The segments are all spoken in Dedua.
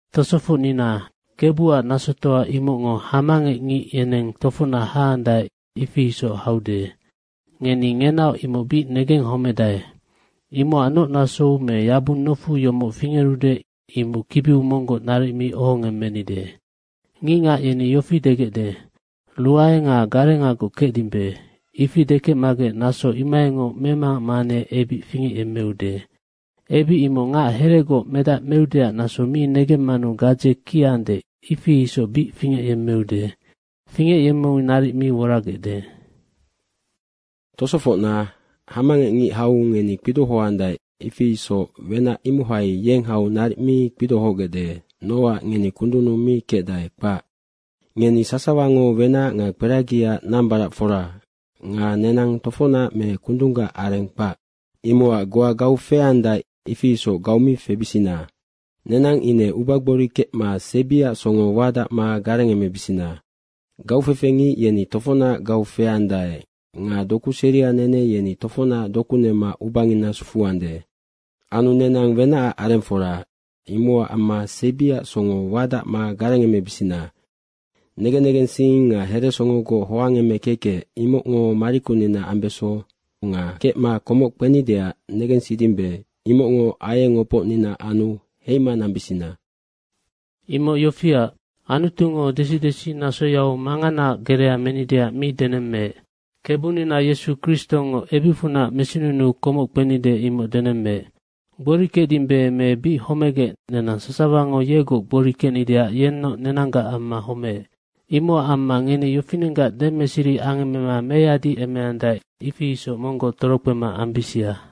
Tosofocnina, Kebuac nasotoa imocngo hamangecngic yeneng tofocnac haandae, ifi isoc haude. Ngeni ngenaoc imoc bic negenghomedae. Imocac noc nasou me yabung nofu yomoc fingerude, imoc kibiu monggoc naric mi ohongemmenide. Nga ngicngac yeni degecde, “Ruae nga garengagoc kecdimbe.” Ifi dekecmagec, naso imohaingoc memangac manganea ebic fingecyemmeude. Ebic imoc ngac heregoc medac meudeac naso mi negemmanu gadze kiande, ifi isoc bic fingecyemmeude. Fingecyemmeu naric mi woragecde. Nga tosofocna, hamangecngic hau ngeni kpidohoandae, ifi isoc wenac imohai yeng hau naric mi kpidohogecde nocac ngeni kundunnu mi kecdae, kpac. Ngeni sasawango wenac nga kperagiaac nambaracfora nga nenang tofocnac me kundunggac areng kpac. Imocac goa gau feandae, ifi isoc gau mi febisina, nenang ine ubagbori kecma sebiac songo wadacma garengemebisina. Nga gaufefe ngic yeni tofocnac gau feandae nga doku seria nene yeni tofocnac doku nema ubangina sufuande. Anu nenang wenacac arengfora. Imocac amma sebiac songo wadacma garengemebisina. Negen negensing nga heresongogoc hoangemekekec, imocngo marikunina ambeso nga kecma komoc kpenideac negensidimbe, imocngo aieng opocnina anu heima nambisina. Imoc yofiac, Anutungo desi desi nasoyau manganaac gerea menideac mi denemmeec, Kebunina Yesu Kristongo ebicfunac mesinunuu komoc kpenide, imoc denemmeec. Gbori kecdimbe me bic homegec, nenang sasawango yegoc gbori kecnideac yennoc nenanggac amma homeec. Imocac amma ngeni yofinenggac demeseri angemema meyadiemeandae, ifi isoc monggoc torokpema ambisia.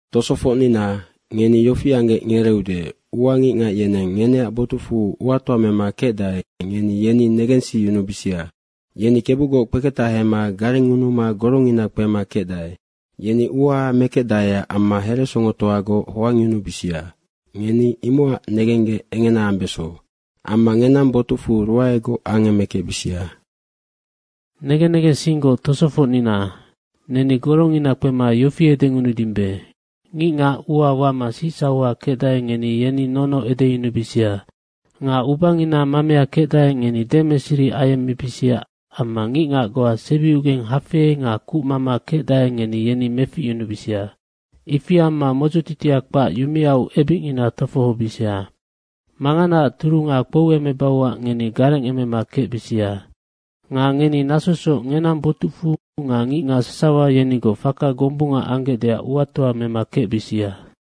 Tosofocnina, ngeni yofi anggec ngereeude, ua ngicngac yeneng ngeneac botucfu uatoa mema kecdae, ngeni yeni negensiyunubisia. Yeni Kebugoc kpeketahema garengngunuma gorongina kpema kecdae. Yeni ua mekecdaeac amma heresongotoagoc hoangyunubisia, ngeni imocac negenggec engena ambeso. Amma ngenang botucfu ruaegoc angemekecbisia. Negen negensinggoc tosofocnina, neni gorongina kpema yofi edengunudimbe, ngicngac ua wama sicsauha kecdae, ngeni yeni nono edeyunubisia. Nga ubangina mamea kecdae, ngeni demeseri ayemmebisia amma ngicngac goa sebiugeng hafei nga kucmama kecdae, ngeni yeni meficyunubisia. Ifi amma modzotitia kpac yumeau ebicngina tofohobisia. Manganaac turunga kpouemebauac ngeni garengemema kecbisia. Nga ngeni nasosoc ngenang botucfu nga ngicngac sasawa yenigoc faka gombunga anggecdeac uatoa mema kecbisia.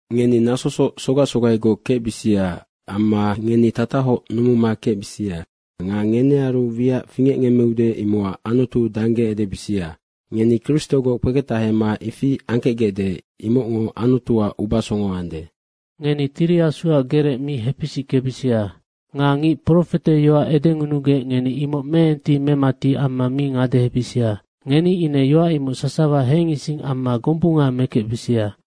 Ngeni nasosoc sogac sogaigoc kecbisia. Amma ngeni tatahoc numuma kecbisia. Nga ngenearu wiac fingecngemmeude imocac Anutu dangge edebisia. Ngeni Kristogoc kpeketahema ifi angkecgecde, imocngo Anutuac ubasongo ande. Ngeni Tiri Asuac gerec mi hepisickebisia. Nga ngic profeteyoac edengunugec ngeni imoc meenti memati amma mi ngadehebisia. Ngeni ine yoac imoc sasawa hengising amma gombunga mekecbisia.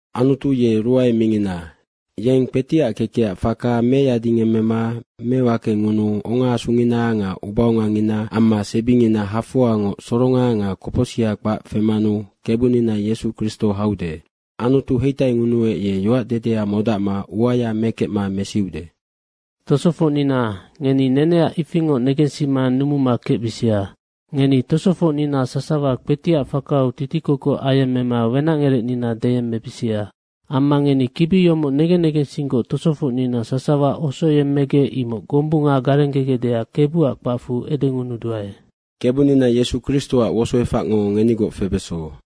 Anutu ye ruae mingina. Yeng kpetiac kekecac faka meyadingemmema mewakengunuu ongaasungina nga ubaongangina amma sebingina hafoangoc soronga nga kopocsiha kpac femanu Kebunina Yesu Kristo haude. Anutu heitaingunuec, ye yoacdedea modacma uaya mekecma mesiude. Tosofocnina, ngeni neneac ifingoc negensima numuma kecbisia. Ngeni tosofocnina sasawa kpetiac fakau titikokoc ayemmema wenacngerecnina deyemmebisia. Amma ngeni kibi yomoc negen negensinggoc tosofocnina sasawa osoyemmegec, imoc gombunga garenggegecdeac Kebuac kpacfu edengunuduae. Kebunina Yesu Kristoac wosoefacngo ngenigoc febeso.